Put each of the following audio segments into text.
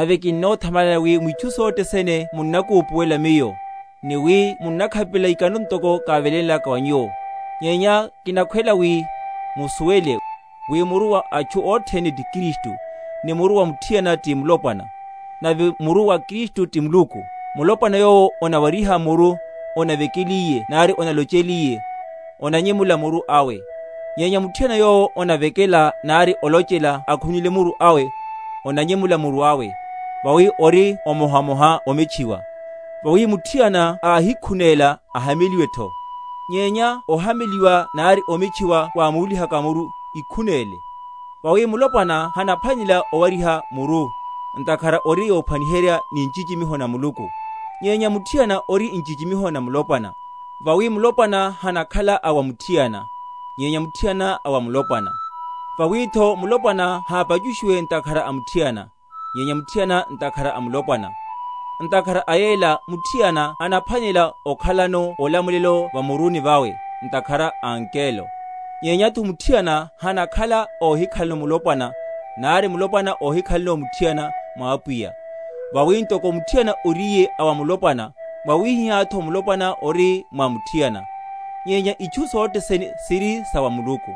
Nave kinnothamalani wi mwitchu sothe sene munnakupuwela miyo, ni wi munnakhapelela ikano ntoko kávelénlaka wa nyuwo. Nyenya kinakhwela wi musuwele, wi muru wa atchu othene ti Kristu; ni muru wa muthiana ti mulopwana; nave muru wa Kristu ti Muluku. Mulopwana yowo onawariha muru, onavekeliye nari onalocheliye, onanyemula muru awe. Nyenya muthiana yowo onavekela, nari olochela, akhununle muru awe, onanyemula muru awe; vawi ori emohamoha ometchiwa. Vawi muthiana ákíkhunéla, ahameliwetho; nyenya ohameliwa nari ometchiwa wámúlihaka muru, íkhunéle. Vawi mulopwana hanaphwanela owariha muru, ntakhara ori yophwaniherya ni nchichimiho na Muluku: nyenya muthiana ori nchichimiho na mulopwana. Vawi mulopwana hanakhala a wa muthiana; nyenya muthiana a wa mulopwana; vawitho mulopwana hápachushiwe ntakhara a muthiana; nyenya muthiana ntakhara a mulopwana; ntakhara a yela muthiana anaphwanela okhalano olamulelo va muruni vawe, ntakhara a angelo, nyenyatho muthiana hanakhala óhikhalano mulopwana, nari mulopwana óhikhalano muthiana, mwa Apwiya. Vawi ntoko muthiana oríye a wa mulopwana, mwawihihátho mulopwana ori mwa muthiana; nyenya itchu sothe sene siri sa wa Muluku.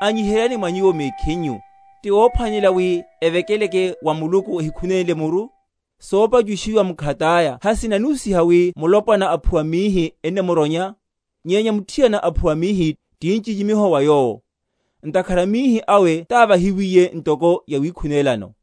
Anyiheryani mwa nyuwo mekhinyu; ti wophwanelela wi evekeleke wa Muluku, ehikhunénle muru? Sopachushiwa mkhataya hasinanihusiha wi mulopwana aphuwa mihi ennamuronya? Nyenya muthiana aphuwa mihi, ti nchichimiho wa yowo; ntakhara mihi awe távahiwiye ntoko yawikhunélano.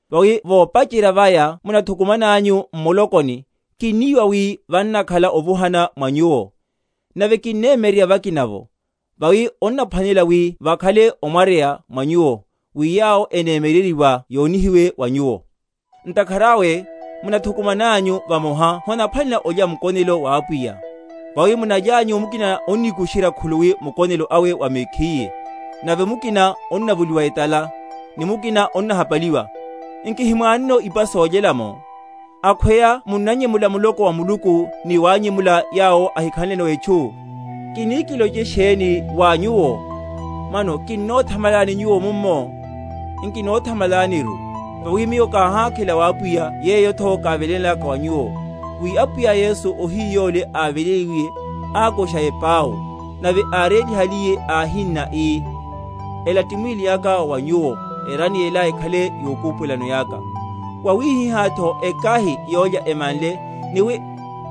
Vawi vopacherya vaya munathukumananyu m’mulokoni, kinniwa wi vannakhala ovuhana mwa nyuwo; nave kinnemyeryerya vakina’vo. Vawi onnaphwanelela wi vakhale omwaryeya mwa nyuwo, wi yawo enemyeryeryiwa yonihiwe wa nyuwo. Ntakhara awe, munathukumananyu vamoha honaphwanelela olya mukonelo wa Apwiya; vawi munalyanyu mukina onnikusherya khuluwi mukonelo awe wa mekhiye, nave mukina onnavoliwa etala, ni mukina onnahapaliwa. Nki himwanono ipa solyelya’mo? Akhweya munnanyemula muloko wa Muluku, ni wanyemula yawo ahikhanleno etchu? Kini kiloche sheni wa nyuwo? Mano kinothamalani nyuwo mummo? Nkinothamalaniru. Vawi miyo káhákhela wa Apwiya, yeyotho kávelénlaka wa nyuwo, wi Apwiya Yesu ohiyu yole áveléliwiye, ákusha epau; nave árélihaliye, áhinna, ii, Ela ti mwíli aka wa wa nyuwo; erani ela ekhale yokupuwelano yaka. Wawihihátho ekahi, yólya emanle, ni wi,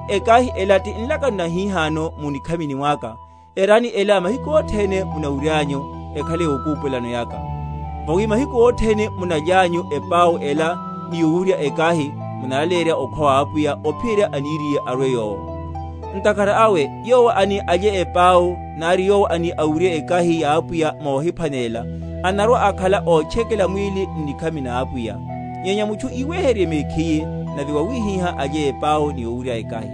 Ekahi ela ti nlakano nahihano mu nikhamini mwaka; erani ela, mahiku othene munawuryanyu, ekhale yokupuwelano yaka. Vawi mahiku othene munalyanyu epau ela ni owurya ekahi, munnalaleyerya okhwa wa Apwiya ophiyerya aniriye arwe Yowo. Ntakhara awe yowo ani alye epau, nari yowo ani awurye ekahi ya Apwiya mohiphwanelela, anarwa‐akhala ótchekela mwíli n’nikhami na Apwiya. Nyenya mutchu iweheryerye mekhiye, nave wawihihá alye epau, ni owurya ekahi.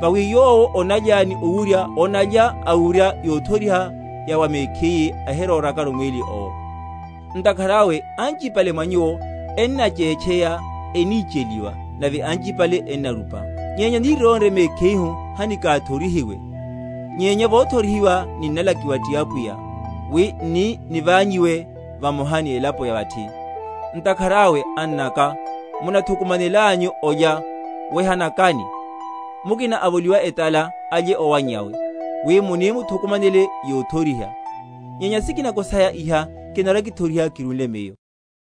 Vawi yowo onalya ni owurya onalya awurya yothoriha ya wa mekhiye, ahirórakaru mwíli owo. Ntakhara awe anchipale mwa nyuwo ennachétcheya, enicheliwa, nave anchipale ennarupa. Nyenya nírónre mekhihu hanikathorihiwe. Nyenya vothorihiwa, ninnalakiwa ti Apwiya, wi n’ni nivanyiwe vamoha ni elapo ya vathi. Ntakhara awe, annaka, munathukumanelanyu olya, wehanakani. Mukina avoliwa etala alye owannyawe; wi muni muthukumanele yothoriha. Nyenya sikinako saya iha kinarwa‐kithoriha kirúle miyo.